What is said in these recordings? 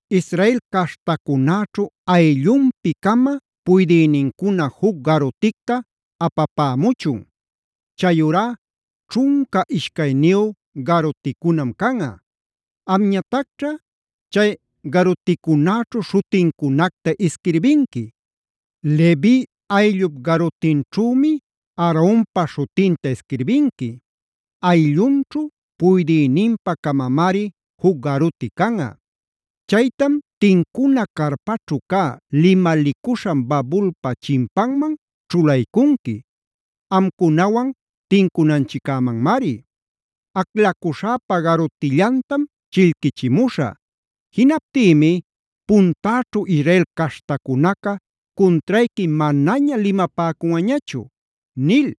“Israel caśhtacunäćhu ayllunpi-cama puydïnincuna juc garuticta apapämuchun; chayurá ćhunca ishcayniyu garuticunam canꞌa. Amñatacćha chay garuticunäćhu śhutincunacta isquirbinqui. Levi ayllup garutinćhümi Aaronpa śhutinta isquirbinqui. Ayllunćhu puydïninpa-camamari juc garuti canꞌa. Chaytam tincuna carpaćhu cä limalicuśhan babulpa chinpanman ćhulaycunqui; amcunawan tincunanchiccämanmari. Aclacuśhäpa garutillantam chillquichimuśhä. Jinaptïmi puntäćhu Israel caśhtacunaca cuntrayqui manaña limapäcunꞌañachu” nil.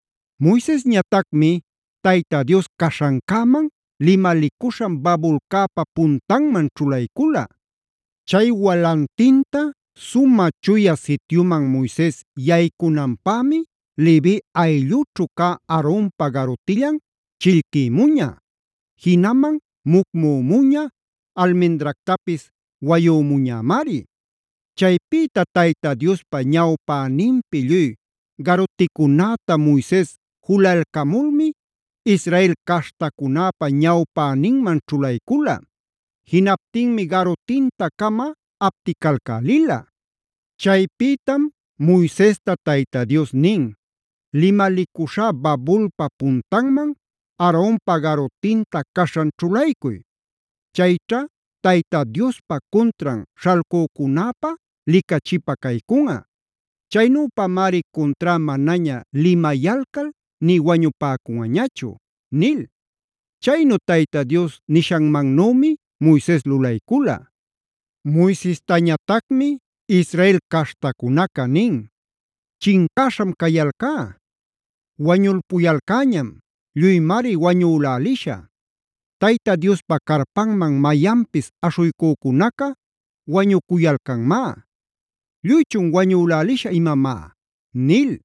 Moisesñatacmi Tayta Dios caśhancäman, limalicuśhan babulcäpa puntanman ćhulaycula. Chay walantinta Sumä Chuya Sityuman Moises yaycunanpämi Levi ayllućhu cä Aaronpa garutillan chillquïmuña; jinaman mucmümuña, almendractapis wayümuñämari. Chaypïta Tayta Diospa ñawpäninpi lluy garuticunäta Moises julalcamulmi Israel caśhtacunäpa ñawpäninman ćhulaycula. Jinaptinmi garutinta-cama apticalcälila. Chaypïtam Moisesta Tayta Dios nin: “Limalicuśhä babulpa puntanman Aaronpa garutinta caśhan ćhulaycuy. Chayćha Tayta Diospa cuntran śhalcücunäpä licachipä caycunꞌa. Chaynüpamari cunträ manaña limayalcal nï wañupäcunꞌañachu” nil. Chaynu Tayta Dios nishanmannümi Moises lulaycula. Moisestañatacmi Israel caśhtacunaca nin: “¡Chincäśham cayalcá! ¡Wañulpuyalcäñam! ¡Lluymari wañülälishä! Tayta Diospa carpanman mayanpis aśhuycücunaca wañucuyalcanmá. ¿Lluychun wañülälishä imamá?” nil.